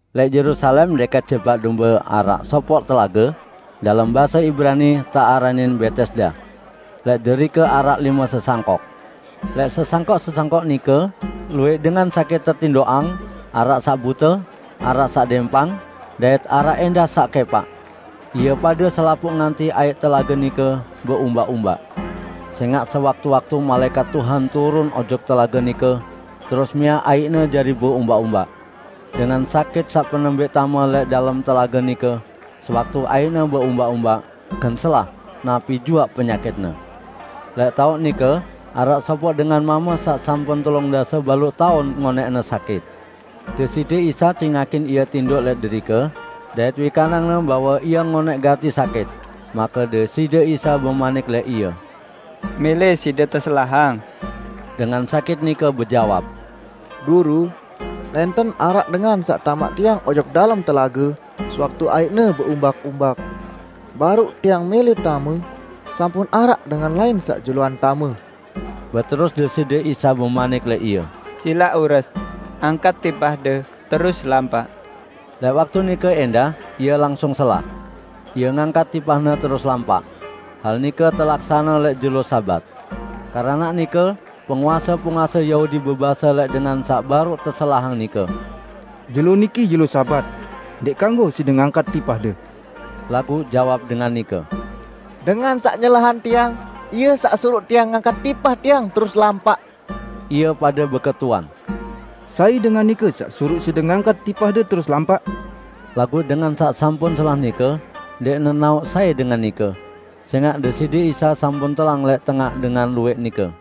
Lẽq Yerusalem dẽkẽt Jebak Dombe araq sopoq telage, dalem base Ibrani tearanin Betesda. Lẽq derike araq lime sesangkok. Lẽq sesangkok-sesangkok nike luwẽq dengan sakit tetindoqang, araq saq bute, araq saq dẽmpang, dait araq ẽndah saq kẽpaq. [Ie pade selapuq ngantih aiq telage nike beumbak-umbak. Sẽngaq sewaktu-waktu malaẽkat Tuhan turun ojok telage nike terus miaq aiqne jari beumbak-umbak. Dengan sakit saq penembẽq tame lẽq dalem telage nike sewaktu aiqne beumbak-umbak, gen selah, napi juaq penyakitne.] Lẽq taoq nike araq sopoq dengan mame saq sampun telung dase baluq taun ngonẽqne sakit. Deside Isa cingakin ie tindoq lẽq derike, dait wikanang-Ne bahwe ie ngonẽq gati sakit; make Deside Isa bemanik lẽq ie, "Mẽlẽ side teselahang?" Dengan sakit nike bejawab, "Guru, nẽnten araq dengan saq tamaq tiang ojok dalem telage sewaktu aiqne beumbak-umbak. Baruq tiang mẽlẽ tame, sampun araq dengan lain saq juluan tame." Beterus Deside Isa lẽq ie, "Silaq ures, angkat tipahde, terus lampaq." Lẽq waktu nike ẽndah ie langsung selah. Ie ngangkat tipahne terus lampaq. Hal nike telaksane lẽq jelo Sabat. Keranaq nike penguase-penguase Yahudi bebase lẽq dengan saq baruq teselahang nike, "Jelo niki jelo Sabat. Ndẽq kanggo side ngangkat tipahde." Laguq jawab dengan nike, "Dengan saq nyelahang tiang, Ie saq suruq tiang ngangkat tipah tiang terus lampaq." Ie pade beketuan, "Sai dengan nike saq suruq side ngangkat tipahde terus lampaq?" Laguq dengan saq sampun selah nike ndẽq nenaoq sai dengan nike, sẽngaq Deside Isa sampun telang lẽq tengaq dengan luwẽq nike.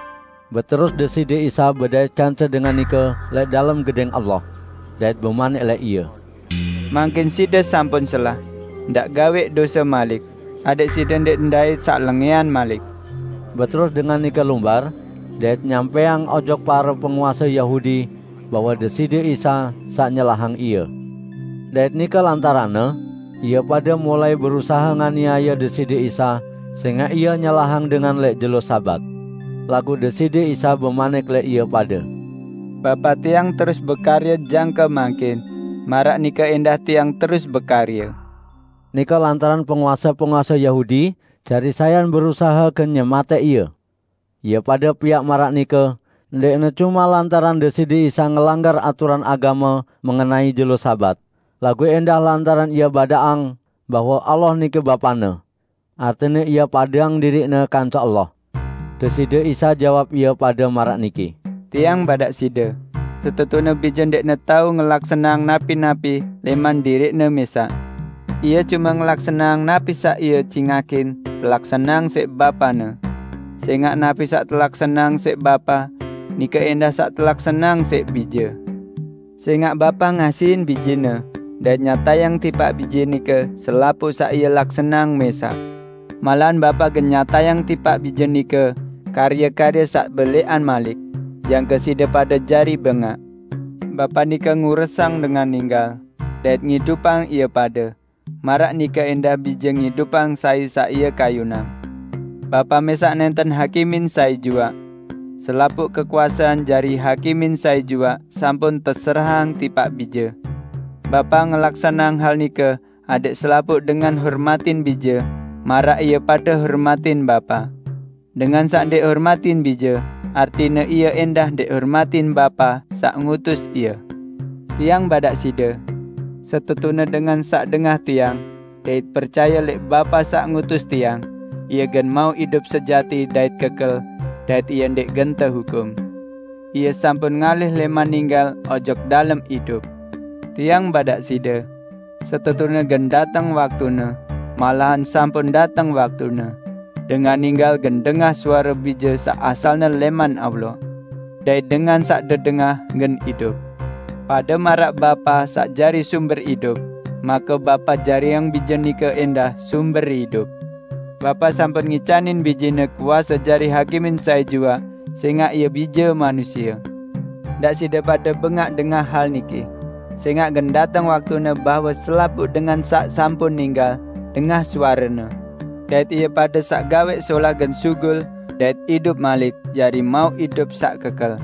Beterus Deside Isa bedait kance dengan nike lẽq dalem Gedẽng Allah, dait bemanik lẽq ie, "Mangkin side sampun selah, ndaq gawẽq dose malik, adẽq side ndẽq ndait saq lengẽan malik." Beterus dengan nike lumbar, dait nyampẽang ojok pare penguase Yahudi bahwe Deside Isa saq nyelahang ie. Dait nike lantaranne, ie pade mulai berusahe nganiaye Deside Isa sẽngaq Ie nyelahang dengan lẽq jelo Sabat. Laguq Deside Isa bemanik lẽq ie pade, "Bapa Tiang terus bekarye jangke mangkin, maraq nike ẽndah Tiang terus bekarye." Nike penguase-penguase Yahudi jari sayan berusahe gen nyematẽq Ie. Ie pade piaq maraq nike, ndẽqne cume lantaran Deside Isa ngelanggar aturan agame mengenai jelo Sabat, laguq ẽndah lantaran Ie badaqang bahwe Allah nike Bapa-Ne; artine Ie padeang diriq-Ne kance Allah. Deside Isa jawab ie pade maraq niki, "Tiang badaq side, setetune Bije ndẽqne tao ngelaksaneang napi-napi lẽman diriq-Ne mẽsaq. Ie cume ngelaksaneang napi saq Ie cingakin telaksaneang siq Bapa-Ne. Sẽngaq napi saq telaksaneang siq Bapa, nike ẽndah saq telaksaneang siq Bije. Sẽngaq Bapa ngasihin Bije-Ne dait nyatayang tipaq Bije nike selapuq saq Ie laksaneang mẽsaq. Malahan Bapa gen nyatayang tipaq Bije nike karye-karye saq belẽqan malik, jangke side pade jari bengaq. Bapa nike nguresang dengan ninggal, dait ngidupang ie pade, maraq nike ẽndah Bije ngidupang sai saq Ie kayunang. Bapa mẽsaq nẽnten hakimin sai juaq. Selapuq kekuasean jari hakimin sai juaq sampun teserahang tipaq Bije. Bapa ngelaksaneang hal nike adẽq selapuq dengan hormatin Bije maraq ie pade hormatin Bapa. Dengan saq ndẽq hormatin Bije artine ie ẽndah ndẽq hormatin Bapa saq ngutus Ie. Tiang badaq side: Setetune dengan saq dengah Tiang, dait percaye lẽq Bapa saq ngutus Tiang, ie gen mauq idup sejati dait kekel, dait ie ndẽq gen tehukum; ie sampun ngalih lẽman ninggal ojok dalem idup. Tiang badaq side: Setetune gen dateng waktune -- malahan sampun dateng waktune -- dengan ninggal gen dengah suare Bije saq asalne lẽman Allah. Dait dengan saq dedengah gen idup. Pade maraq Bapa saq jari sumber idup, make Bapa jariang Bije nike ẽndah sumber idup. Bapa sampun ngicanin Bije-Ne kuase jari hakimin sai juaq, sẽngaq Ie Bije Manusie. Ndaq side pade bengaq dengah hal niki, sẽngaq gen dateng waktune bahwe selapuq dengan saq sampun ninggal dengah suare-Ne, dait ie pade saq gawẽq solah gen sugul dait idup malik jari mauq idup saq kekel,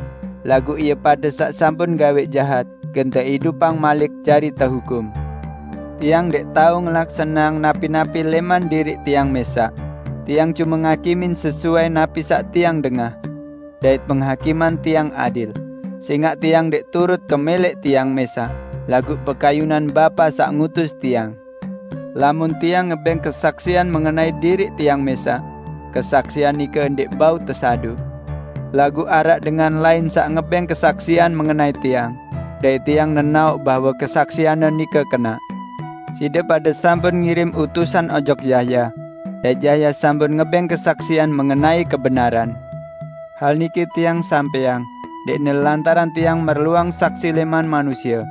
laguq ie pade saq sampun gawẽq jahat gen teidupang malik jari tehukum." "Tiang ndẽq tao ngelaksaneang napi-napi lẽman diriq Tiang mẽsaq, Tiang cume ngakimin sesuai napi saq Tiang dengah. Dait penghakiman Tiang adil, sẽngaq Tiang ndẽq turut kemẽlẽq Tiang mẽsaq, laguq pekayunan Bapa saq ngutus Tiang. Lamun Tiang ngebẽng kesaksian mengenai diriq Tiang mẽsaq, kesaksian nike ndẽq bau tesaduq. Laguq araq dengan lain saq ngebẽng kesaksian mengenai Tiang, dait Tiang nenaoq bahwe kesaksian-Ne nike kenaq. Side pade sampun ngirim utusan ojok Yahya, dait Yahya sampun ngebẽng kesaksian mengenai kebenaran. Hal niki Tiang sampẽang, ndẽqne lantaran Tiang merluang saksi lẽman manusie,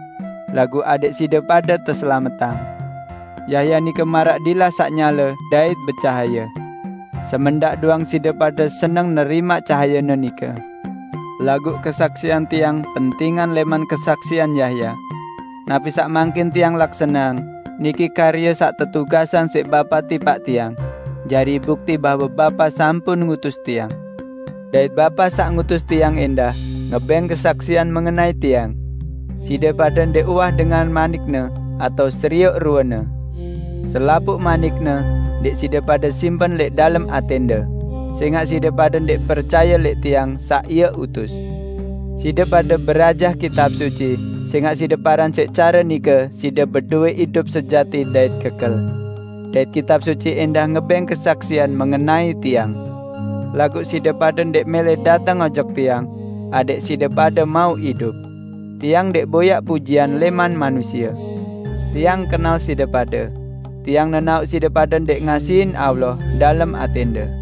laguq adẽq side pade teselametang. Yahya nike maraq dilah saq nyale dait becahaye. Semendaq doang side pade seneng nerimaq cahayene nike. Laguq kesaksian Tiang pentingan lẽman kesaksian Yahya. Napi saq mangkin Tiang laksaneang, niki karye saq tetugasang siq Bapa tipaq Tiang, jari bukti bahwe Bapa sampun ngutus Tiang. Dait Bapa saq ngutus Tiang ẽndah ngebẽng kesaksian mengenai Tiang. Side pade ndẽq uwah dengah manik-Ne atao serioq rue-Ne. Selapuq manik-Ne ndẽq side pade simpen lẽq dalem atẽnde, sẽngaq side pade ndẽq percaye lẽq Tiang saq Ie utus. Side pade berajah Kitab Suci sẽngaq side paran siq care nike side bedowẽ idup sejati dait kekel. Dait Kitab Suci ẽndah ngebẽng kesaksian mengenai Tiang. Laguq side pade ndẽq mẽlẽ dateng ojok Tiang adẽq side pade mauq idup. Tiang ndẽq boyaq pujian lẽman manusie. Tiang kenal side pade. Tiang nenaoq side pade ndẽq ngasihin Allah dalem atẽnde.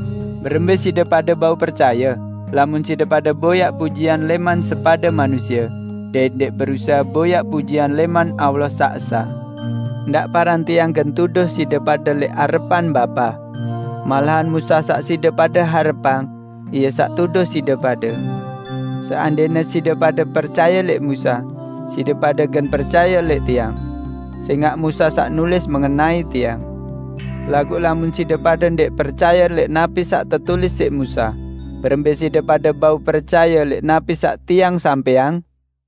Berembẽ side pade bau percaye, lamun side pade boyaq pujian lẽman sepade manusie, dait ndẽq berusahe boyaq pujian lẽman Allah saq Esa? Ndaq paran Tiang gen tuduh side pade lẽq arepan Bapa. Malahan Musa saq side pade harepang, ie saq tuduh side pade. Seandẽne side pade percaye lẽq Musa, side pade gen percaye lẽq Tiang, sẽngaq Musa saq nulis mengenai Tiang. Laguq lamun side pade ndẽq percaye lẽq napi saq tetulis siq Musa, berembẽ side pade bau percaye lẽq napi saq Tiang sampẽang?"